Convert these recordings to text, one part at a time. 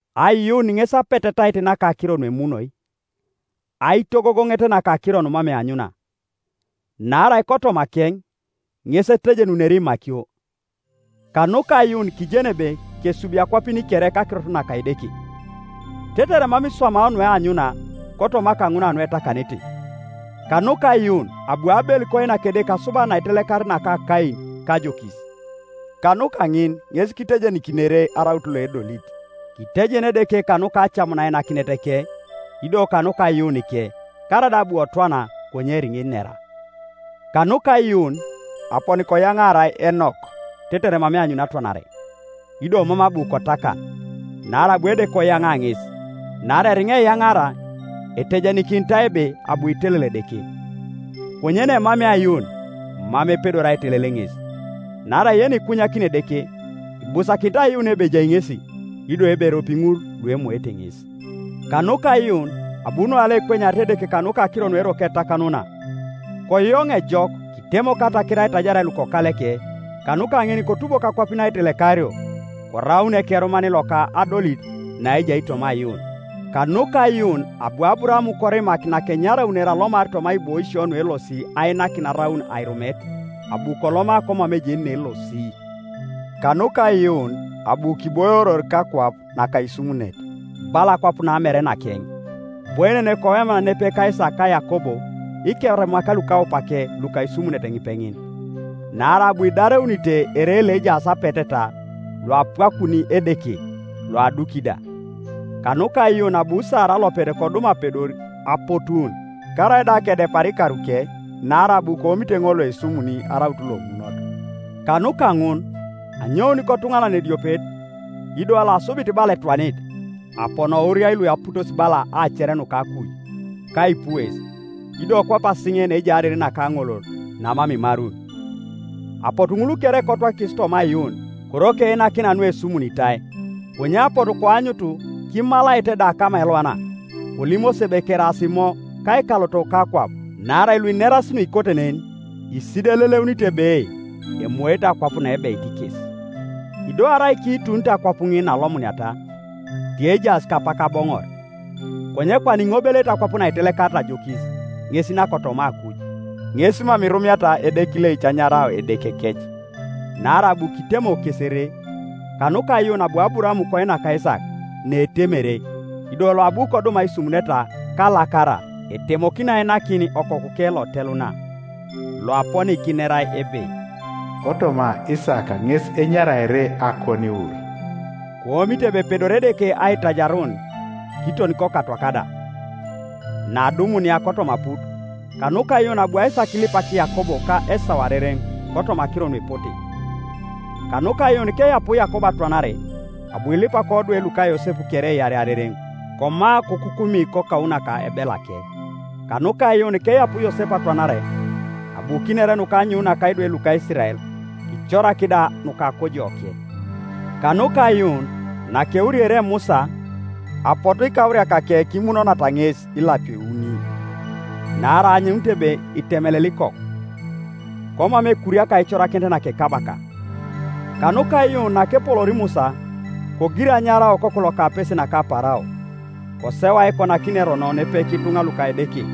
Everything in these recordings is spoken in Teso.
Aiyuun ŋes apetetait naka akiro nuemunoi, aitogogoŋet naka akiro numam eanyuna. Naarai kotomakeŋ ŋes etejenunere imakio. Kanuka aiyuun kijen ebe kesubio akwapin kere kakirot naka Edeke, tetere mam iswamao nueanyuna kotoma kaŋun kanuetakanete. Kanuka aiyuun abu Abel koinak Edeke asubanit naitelekarit naka Kain kajokis, kanuka ŋin ŋes kitejenikinere araut loedolit, kitejen Edeke kanuka acamun ainakinetake, ido kanuka aiyuunike, karaida abu kotwana, konye eriŋa inera. Kanuka aiyuun aponi koyaŋaarai Enok tetere mam eanyuni atwanare, ido mam abu kotakan, naarai abu Edeke koyaŋa ŋes. Naarai eriŋa eyanaara etejenikinitai ebe abu kitelel Edeke. Konye neemamea aiyuun mam epedor aitelel ŋes. Naarai yenikunyakini Edeke ibusakinit aiyuun ebe ejai ŋesi, ido ebe eropi ŋul luemoete ŋes. Kanuka aiyuun abu Noa loekwenyarit Edeke kanuka akiro nukeroko etakanuna, koyoŋ ejok, kitemok ataker aitaiaria lukokaleke; kanuka gin kotubok akwapin aitelekario, koraun ekerunan loka adolit naejai toma aiyuun. Kanuka aiyuun abu Aburaam korimak nakenyaraunere alomar toma aibois naelosio ainakin araun airumet; abu koloma komam ejeni neelosi. Kanuka aiyuun abu kiboioror kakwap naka aisumunet, bala akwap namere nakeŋ, iboienenei koweman nepepe ka Isaak ka Yakob ikerumak lukaupake luka aisumunet ŋipeŋin. Naarai abu kidareunite ere loejaas apeteta, loapwakun Edeke loaduki da. Kanuka aiyuun abu Sara alopet kodum apedor apotuun karaida kedepara ikaruke, naarai abu koomite ŋol loesumuni araut lomunot. Kanuka ŋun anyoun kotuŋanan ediopet, ido loasubit bala etwanit, aponi kowuriai lueputosi bala aacer nuka akuj kaipues, ido kwape asiŋe naejai ariri naka aŋolol namam imarun. Apotu ŋul kere kotwakikis toma aiyuun, koroko einakina nuesumunitai, konye apotu koanyutu kimalaete da kama elwana, kolimosi ebe keraas imo ka ikalotok kakwap. Naarai luinerasi nuikote nen isideleleunito ebe emoete akwap naebeit kes. Ido arai kiitunito akwap ŋin naalomuniata, tiejaas kapak aboŋor. Konye kwana iŋobeleete akwap naitelekarit ajokis, ŋes nakotoma akuj. Ŋes mam irumiata Edeke ileic anyarao Edekekec, naarai abu kitemok kes ere. Kanuka aiyuun, abu Aburaam koinak Isaak, naetemere, ido loabu kodum aisumuneta kalakara etemokino ainakin okokuke loteluna, loaponi kinerai ebe, “Kotoma Isaak ŋes enyaraere akoniwur.” Koomite ebe epedori Edeke aitajarun, kiton kokatwak da; neadumunia kotoma aput. Kanuka aiyuun abu Isaak kilipak Yakob ka Esau arereŋ kotoma akiro nuepote. Kanuka aiyuun keapu Yakob atwanare, abu kilipak odwe luka Yosep kere iarei arereŋ, koma, kokukumi kakou naka ebelake. Kanuka aiyuun keapu Yosep atwanare abu kiner nuka anyoun naka idwe luka Isirael, kicorak da nuka akojoke. Kanuka aiyuun nakeuriere Musa, apotu ikauriakake kimunonata ŋes ilapio iuni, naarai aanyunito ebe itemelel ikoku; komam ekuriaka aicorakinet naka ekabaka. Kanuka aiyuun nakepoloor Musa, kogir anyarao okoku loka apese naka Parao, koseu aikonakinio erono nepepe kituŋa luka Edeke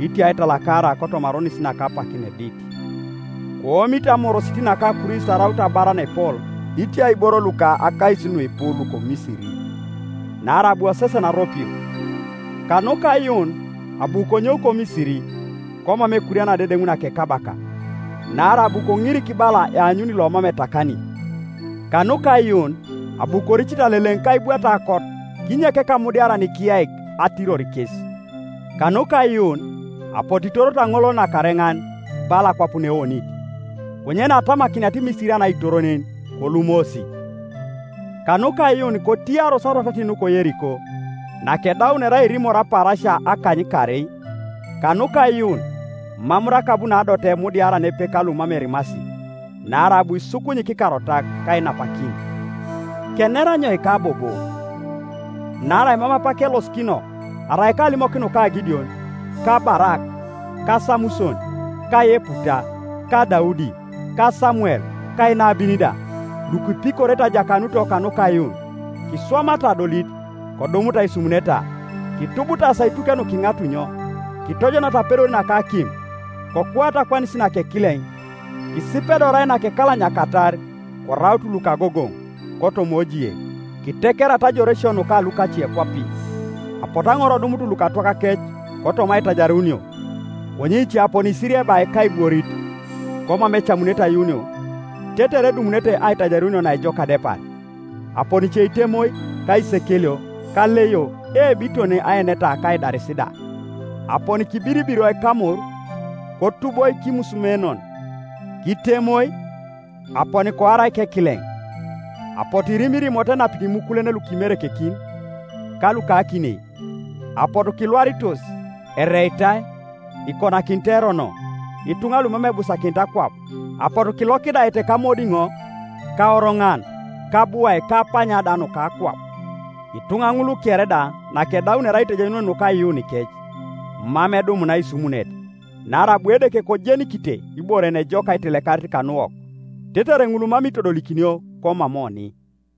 itia aitalakara kotoma aronis naka apak naedit. Koomite amorosit naka Kristo araut abar naepol itia iboro luka akais nuipu luko Misiri, naarai abu kosesen aropio. Kanuka aiyuun abu konyou ko Misiri, komam ekuriana adedeŋ naka ekabaka; naarai abu konirik bala eanyuni lomam etakani. Kanuka aiyuun abu koricite Aleleŋ ka aibwat aokot kinyek Ekamudiaran ikiyaik atiror kes. Kanuka aiyuun apotu kitoroto Aŋolol Nakareŋan bala akwap naeonit; konye naketamakiniata Imisirian aitor nen, kolumosi. Kanuka aiyuun kotiyaros arwatatin nuka Yeriko, nakedaunere airimor apaarasia akanykaarei. Kanuka aiyuun mam Rakab naadote emudiara nepepe ka lumam erimasi, naarai abu kisukunyik ikarotak kainapakin. Kener anyoika bobo? Naarai mam apak kelosikino arai kalimok nuka Gideon, ka Barak, ka Samuson, ka Yeputa, ka Daudi, ka Samuel ka inabin da,— lukipikorete ajakanuto kanuka aiyuun, kiswamata adolit, kodumut aisumuneta, kitubutaasi aituke nuka iŋatunyo, kitojonata apedor naka akim, kokuata akwanis naka ekileŋ, kisipedoroi nakekalanyakatar, koraut lukagogoŋ kotoma ojie, kitekerata ajoresio nuka lukacekwapin. Apotu aŋor kodumut lukatwakakec kotoma aitajarunio, konye ice aponi kisiriebai kaibworit, komam ecamunete ayuunio, tetere edumunete aitajarunio naejok adepar. Aponi ice kitemoi kaisekelio ka aleio, eebo, kiton aeneta ka aidaris da. Aponi kibiribiroi kamor, kotuboi kimusumenon, kitemoi, aponi koarai kekileŋ; apotu kirimirimoto enapito imukulen luka imerekekin ka luka akinei; apotu kilwaritos, ereitai, kikonakinitai erono,— ituŋa lumam ebusakinit akwap, apotu kilokidaete kamodiŋo, ka oroŋan, ka abuai ka apanya da nuka akwap. Ituŋa ŋul kere da nakedaunere aitejenun kanuka aiyuunikec, mam edumuna aisumunet, naarai abu Edeke kojenikinite ibore yenejok aitelekarit kanuwok, tetere ŋul mam itodolikinio komam oni.